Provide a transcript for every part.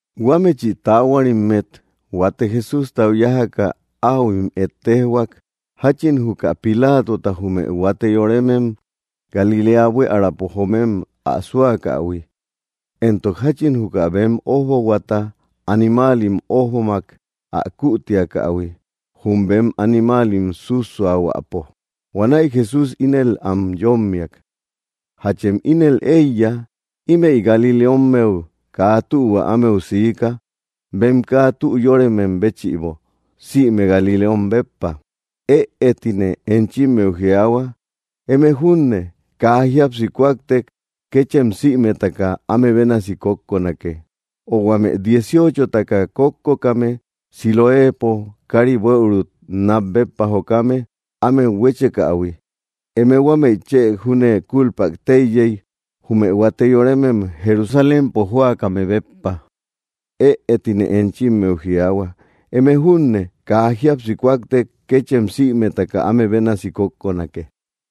Huámechi taahuarimmet huate Jesústau yájaka, áhuim ejtejhuak jáchin juka Pilatota jume huate yoremem Galiléa buiärapo joomem ä súakähui, éntok jáchin juka bem ójbohuata animaalim ójbomak ä kuutiakähui, jum bem animaalim sússuaahuäpo. Huanäi Jesús ínel am yómmiak: —¿Jachem ínel éiya, ímëi galileommeu kaa tühua ámeu siika, bem kaa tü yóremem béchïbo, sïme galileom béppa? Ëe tine enchimmeu jiaahua. Eme júne kaa jíapsi kúaktek, kéchem sïmetaka áme bénasi kókkonake. O, ¿huame dieciochotaka kókkokame, Siloéepo kári buëuru nat béppa jokame, ámet huéchekähui, eme huamei chë júne cúlpak téiyey, jume huate yoremem Jerusalémpo jóakame béppa? Ëe tine enchimmeu jiaahua. Eme júne kaa jíapsi kúaktek, kéchem sïmetaka áme bénasi kókkonake.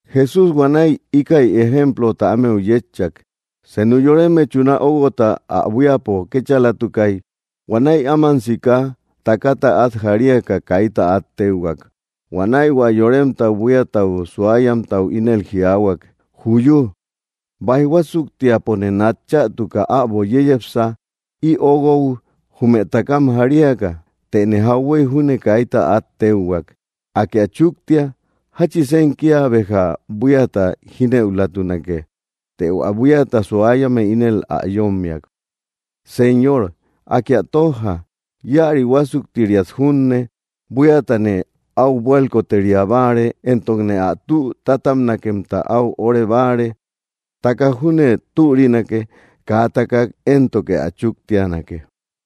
Jesús huanäi íkäi ejemplota ámeu yétchak: —Senu yoreme chuna óuguota ä buíapo kéchalatukay. Huanäi áman sika takata át jariaka, kaita át téuhuak. Huanäi hua yoremtau buíata suayamtau ínel jiaahuak: “¡Juyu! Báij huásuktiapone nat chätuka äbo yeyepsa, ï óuguou, jume takam jariaka. Tëne jauhuey júne kaita át téuhuak. Akë ä chúktia. ¿Jáchisen kía béja buíata jínëulatunake?” Të hua buíata suayame ínel ä yómmiak: ‘‘Señor, Akë ä tójja, íäri huásuktiriat junne. Buíatane ä buálkoteria báare, éntokne ä tü tátabnakemta áu óre báare. Takak júne türinake, kaa ä takak éntoke ä chúktianake.”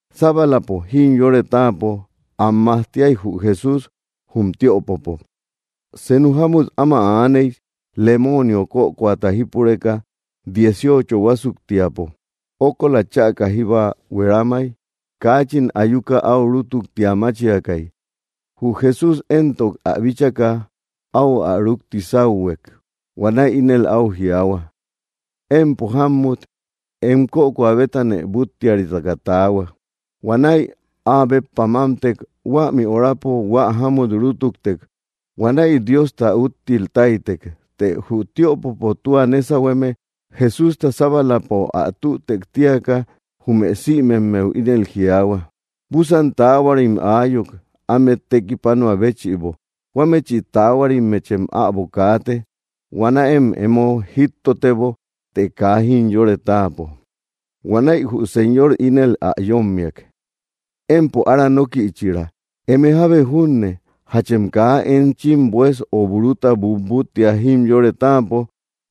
Sábalapo jimyore táapo am majtiay jü Jesús jum tiöpopo. Senu jámut áma aaney, lemoonio kökoata jípureka dieciocho huásuktiapo; ókola chäka jíba hueramay. Kaachin ayuka áu rútuktia máchiakay. Jü Jesús éntok ä bíchaka, áu ä rúkti sáuhuek. Huanäi ínel áu jiaahua: —Empo jámmut, em kökoa bétanë búttiaritaka taahua. Huanäi áa béppa mámtek. Huämi horapo hua jámut rútuktek. Huanäi Diosta úttil táytek. Të jü tiöpopo tua nésahueme, Jesústa sábalapo ä tütek tíaka, jume sïmemmeu ínel jiaahua: —Búsan taahuarim aayuk, ámet tekipanoä béchïbo. Huamechï taahuarimmechem äbo kaate. Huanäem emo jíttotebo, të kaa jimyore táapo. Huanäi jü Señor ínel ä yómmiak: —¡Empo ára nókïchira! ¿Eme jábe júne jachem kaa enchim bues o buruta butbúttia jimyore táapo,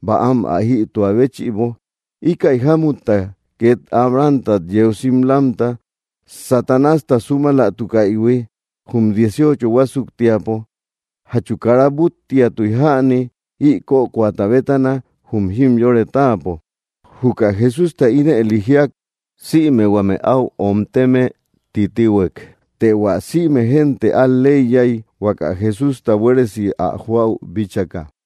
bäam ä jïtua béchïbo? Íkäi jámutta, két Abrahamtat yeu simlamta Satanásta súmalatukaïhui jum dieciocho huásuktiapo, ¿jachu kara búttiatui jäni ï kökoata bétana, jum jimyore táapo? Juka Jesústa ínëli jíak, sïme huame áu omteme titihuek. Të hua sïme génte al‑leiyay, huaka Jesústa buéresi ä joäu bíchaka.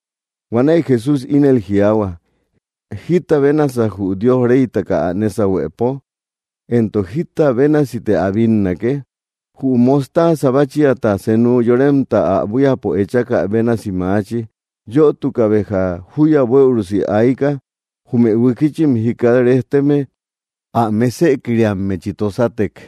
Huanäi Jesús ínel jiaahua: —¿Jíta bénasa, jü Diosta reytaka ä nésahuepo? ¿Éntok jita bénasite ä bínnake? Jü mostaaza báchiata senu yoremta ä buíapo echakä bénasi maachi. Yötuka béja júya bueürusi ayka, jume huikichim jikat rejteme ä mésëkiriammechi tosatek.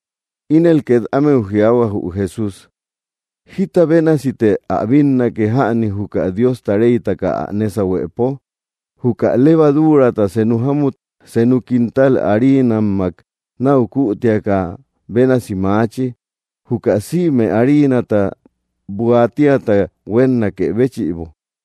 Ínel két ámeu jiaahua jü Jesús: —¿Jíta bénasite ä bínnake jäni, juka Diosta reytaka ä nésahuepo? Juka levaduurata senu jámut senu quintal hariinammak náu kuutiakä bénasi maachi, juka sïme hariinata buaatiata huénnakë béchïbo.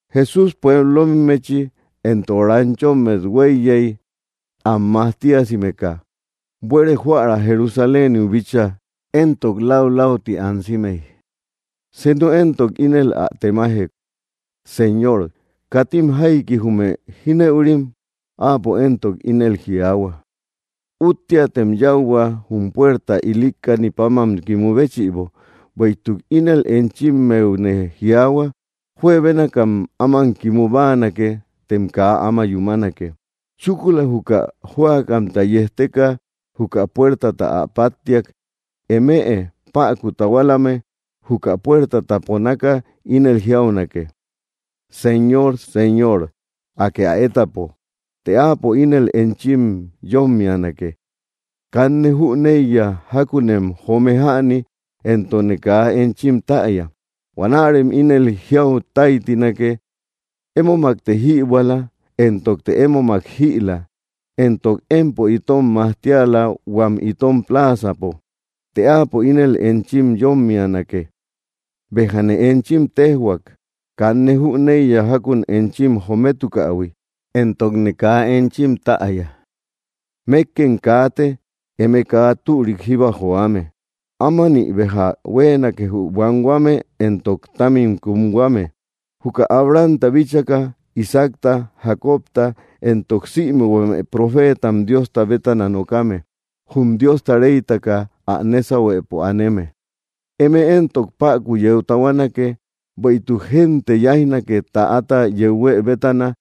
Jesús pueblommechi éntok ranchommet huéiyey, am majtiasimeka, buere joära Jerusaléniu bíchaa, éntok laulauti ansimey. Senu éntok ínel ä temajek: —Señor, ¿katim jaiki jume jínëurim? Áapo éntok ínel jiaahua: —Úttiatem yáuhua jum puerta ilikkani páman kimu béchïbo, bueïtuk ínel enchimmeune jiaahua, juebénakam áman kimu báanake, tem kaa áma yúmanake. Chúkula juka jóakamta yejteka juka puertata ä páttiak, eme päku tahualame juka puertata ponaka ínel jiaunake: ‘‘Señor, Señor, Akë ä étapo.” Të áapo ínel enchim yómmianake: ‘‘Kanne jüneiya jákunem joome jäni, éntokne kaa enchim täya.” Huanärem ínel jiau táytinake: ‘‘Émomakte jïbuäla, éntokte émomak jïla, éntok empo itom majtiala huam itom pláazapo.” Të áapo ínel enchim yómmianake: ‘‘Béjane enchim téjhuak, kanne jüneiya jákun enchim jometukähui, éntokne kaa enchim täya. ¡Mékkem kaate, eme kaa türik jíba joame!” Ámanï béja huéenake jü buanhuame éntok támim kumhuame, juka Abrahamta bíchaka, Isaacta, Jacobta, éntok sïme huame profeetam Diosta bétana nokame jum Diosta reytaka ä nésahuepo aneme. Eme éntok päku yeu tahuanake. Bueïtuk génte yáijnake täata yeu huë bétana,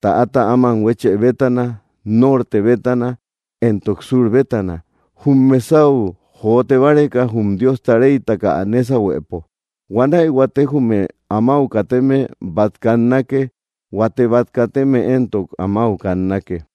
täata áman huéchë bétana, norte bétana, éntok sur bétana jum mesau jote báreka jum Diosta reytaka ä nésahuepo. Huanäi huate jume amáu kateme bát kannake. Huate bát kateme éntok amáu kannake.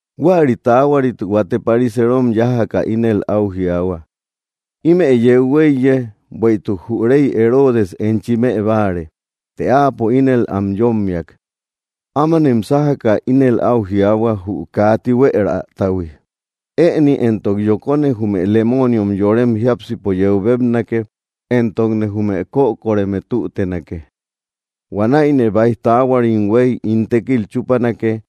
Huäri taahuarit huate pariseerom yájaka ínel áu jiaahua: —Ímë yeu huéiye, bueïtuk jü rey Heroodes enchi mëbáare. Të áapo ínel am yómmiak: —Ámanem sájaka ínel áu jiaahua jü kaa tihueratahui: “Ëni éntok yokone jume lemooniom yorem jiápsipo yeu bébnake, éntokne jume kökoreme tútenake. Huanäine báij taahuarim huéy ín tékil chúpanake.”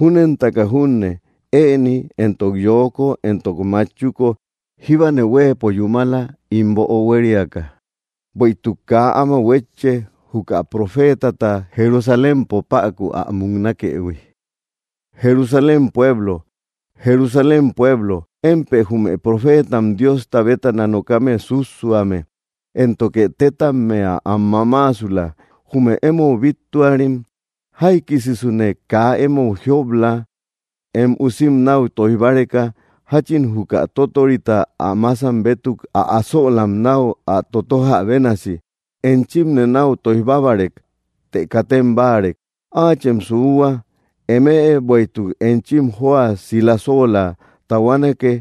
Júnentaka junne, ëni éntok yoko, éntok machuko jíbane huéepo yúmala ín böo huériaka, bueïtuk kaa áma huétche, juka profeetata Jerusalémpo päku ä muknakëhui. ’¡Jerusalén pueblo, Jerusalén pueblo, émpë jume profeetam Diosta bétana nokame sússuame, éntoke tétammea am mamaasula jume émou bíttuarim! Jaikisisune kaa émou jiop‑la em usim náu tóij báreka jáchin juka tótorita ä masam bétuk ä asölam náu ä totojä bénasi, enchimne náu tóij bábarek, të katem báarek. Áachem suuhua, eme, bueïtuk enchim jóa silasoola tahuanake,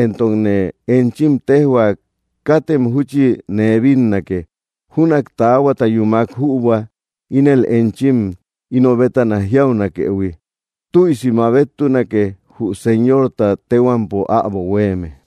éntokne enchim téjhua, katem júchi nee bínnake, júnak taahuata yúmak jübua, ínel enchim ino bétana jiaunakëhui: ‘‘¡Tüisi mabettunake jü Señorta téhuampo äbo huéeme!”